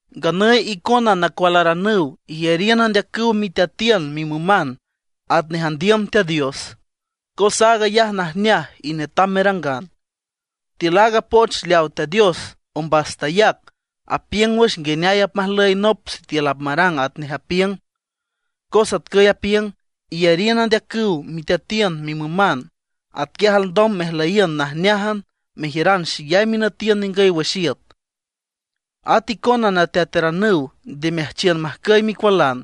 Nganüy icona nacualaranüw, iyariün andeacüw miteatiün mimüman, atnej andiüm Teat Dios; cos aag ayaj najneaj y netam merangan. Tiül aaga poch leaw Teat Dios ombas tayac, apiüng wüx nguineay apmajlüy nop sitiül apmarang atnej apiüng, cos atcüy apiüng: “Iyariün andeacüw miteatiün, mimüman; atquiaj alndom mejlüyiün najneájan, mejiüran xeyay minütiün ningüy wüx iüt”. At icona nateataranüw, nde meajchiün majcüy micualan,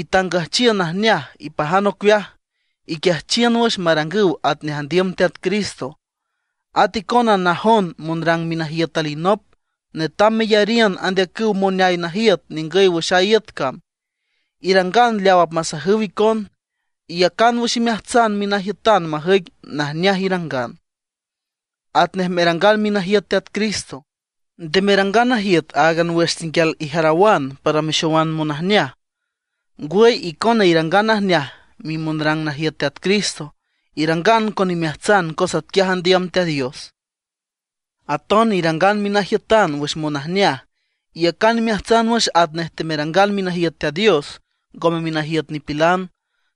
itangüjchiün najneaj, ipajan ocueaj, iquiajchiün wüx marangüw atnej andiüm Teat Cristo. At icona najon monrang minajiüt alinop, netam meyariün andeacüw moneay najiüt ningüy wüx a iüt cam; irangan leaw apmasajüw icon, iyacan wüx imeajtsan minajiütan majüic najneaj irangan, atnej merangan minajiüt Teat Cristo. Nde merangan najiüt áagan wüx tenguial ijarawan para mexoman monajneaj, ngwüy icona irangan najneaj mimonrang najiüt Teat Cristo, irangan con imeajtsan cos atquiaj andiüm Teat Dios. Aton irangan minajiütan wüx monajneaj. Iyacan imeajtsan wüx atnej temerangan minajiüt Teat Dios, ngome minajiüt nipilan.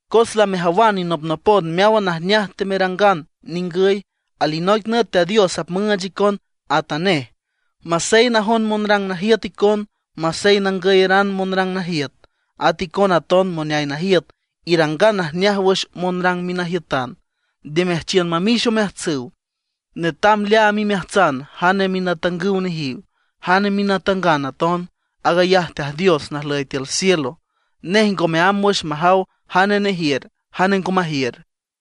Cos lamejawan inopnopon meáwan najneaj temerangan ningüy, alinoic nüt Teat Dios apmüüch icon atanej. Masey najon monrang najiüt icon, masey nangüyeran monrang najiüt. At icona aton moneay najiüt, irangan najneaj wüx monrang minajiütan, nde meajchiün mamix omeajtsüw. Netam leaam imeajtsan jane minatangüw nejiw, jane minatangan aton. Aag ayaj Teat Dios najlüy tiül cielo. Nej ngome amb wüx majaw jane nejiür, jane ngo majiür.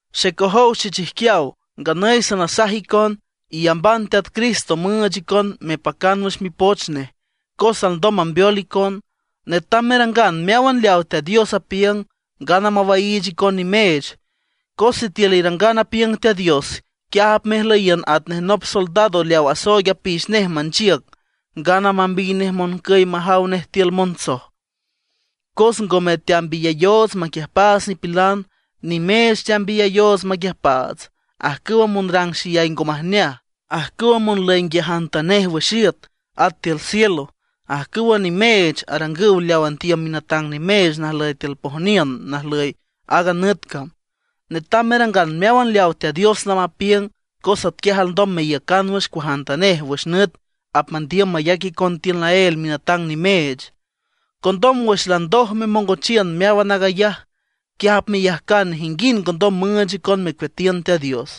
Xecojow xechijquiaw, nganüy sanasaj icon, iyamban Teat Cristo müüch icon mepacan wüx mipoch nej, cos alndom mambeol icon. Netam merangan meáwan leaw Teat Dios apiüng, ngana mawaiich icon nimeech. Cos sitiül irangan apiüng Teat Dios, quiaj apmejlüyiün atnej nop soldado leaw asooig apix nej manchiüc ngana mambiy nej moncüy majaw nej tiül montsoj. Cos ngome teambiyayoots maquiüjpaats nipilan; nimeech teambiyayoots maquiüjpaats, ajcüw monrang xeyay ngo majneaj, ajcüw monlüy nquiajantanej wüx iüt at tiül cielo. Ajcüwa nimeech arangüw leaw andiüm minatang nimeech najlüy tiül pojniün najlüy aaga nüt cam. Netam merangan meáwan leawa Teat Dios lamapiüng, cos atquiaj alndom meiücan wüx cuajantanej wüx nüt apmandiüm mayac icon tiül naél minatang nimeech. Condom wüx landoj memongochiün meáwan aag ayaj, quiaj apmeyajcan nejinguind ngondom müüch icon mecueatiün Teat Dios.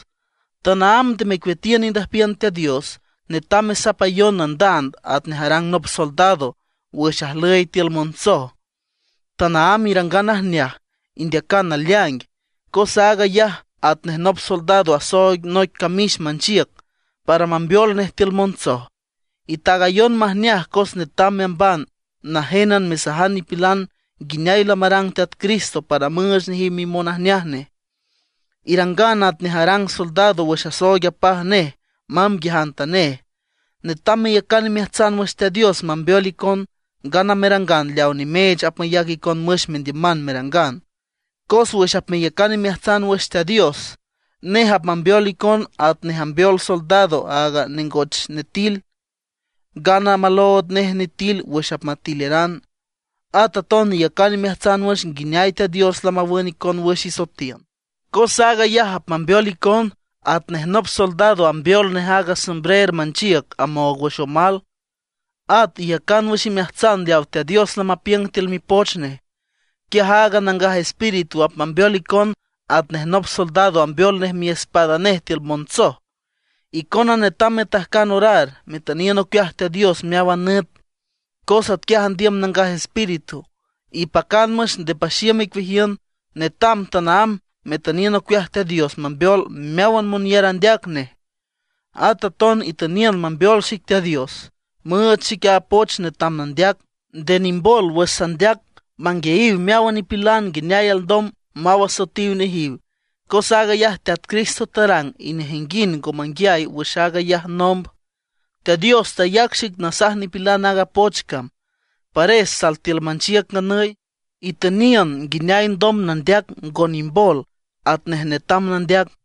Tanaámb nde mecueatiün indüjpiün Teat Dios. Netam mesapayon nandand atnej arang nop soldado wüx ajlüy tiül montsoj. Tanaámb irangan najneaj, indeacan naleaing, cos aag ayaj atnej nop soldado asooig noic camix manchiüc para mambeol nej tiül montsoj. Itaagayon majneaj cos netam meamban najénan mesajan nipilan nguineay lamarang Teat Cristo para müüch nejiw mimonajneaj nej. Irangan atnej arang soldado wüx asooig apaj nej mamb nguiajantanej. Netam meyacan imeajtsan wüx Teat Dios mambeol icon, ngana merangan leawa nimeech apmayac icon wüx mendiüman merangan; cos wüx apmeyacan imeajtsan wüx Teat Dios nej apmambeol icon atnej ambeol soldado aaga nengoch nitil, ngana malood nej nitil wüx apmatileran. At aton iyacan imeajtsan wüx nguineay Teat Dios lamawün icon wüx isoetiün. Cos aag ayaj apmambeol icon, atnej nop soldado ambeol nej aaga sombrer manchiüc amoog wüx omal. At iyacan wüx imeajtsan leawa Teat Dios lamapiüng tiül Mipoch nej, quiaj aaga Nangaj Espíritu apmambeol icon atnej nop soldado ambeol nej miespada nej tiül montsoj. Icona netam metajcan orar, metüniün ocueaj Teat Dios meáwan nüt, cos atquiaj andiüm Nangaj Espíritu. Ipacan wüx, nde paxiüm icueajiün; netam tanaámb metüniün ocueaj Teat Dios mambeol meáwan monyar andeac nej. At aton itüniün mambeol xic Teat Dios, müüch xic a poch netam nandeac, nde nimbol wüx sandeac manguiayiw meáwan nipilan nguineay alndom maw asoetiw nejiw. Cos aag ayaj Teat Cristo tarang y nejinguind ngo manguiay wüx aag ayaj nomb. Teat Dios tayac xic nasaj nipilan aaga poch cam, pares sal tiül manchiüc nganüy. Itüniün nguineay alndom nandeac ngo nimbol atnej netam nandeac.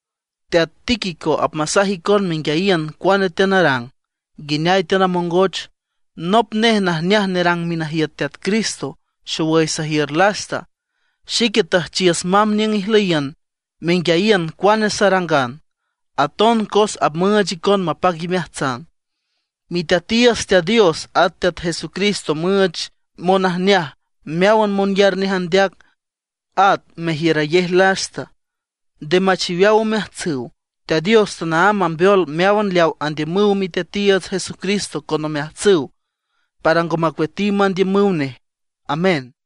Teat Tíquico apmasaj icon menguiayiün cuane teanarang, nguineay teanamongoch. Nop nej najneaj nerang minajiüt Teat Cristo, xowüy sajiür lasta. Xique tüjchiüs mamb niüng ijlüyiün menguiayiün cuane sarangan, aton cos apmüüch icon mapac imeajtsan. Miteatiiüts Teat Dios at Teat Jesucristo müüch monajneaj meáwan monyar nej andeac, at mejiürayej lasta, nde machiweaw omeajtsüw. Teat Dios tanaámb mambeol meáwan leawa andiümüw Miteatiiüts Jesucristo con omeajtsüw, para ngo macueatiw mandiümüw nej. Amén.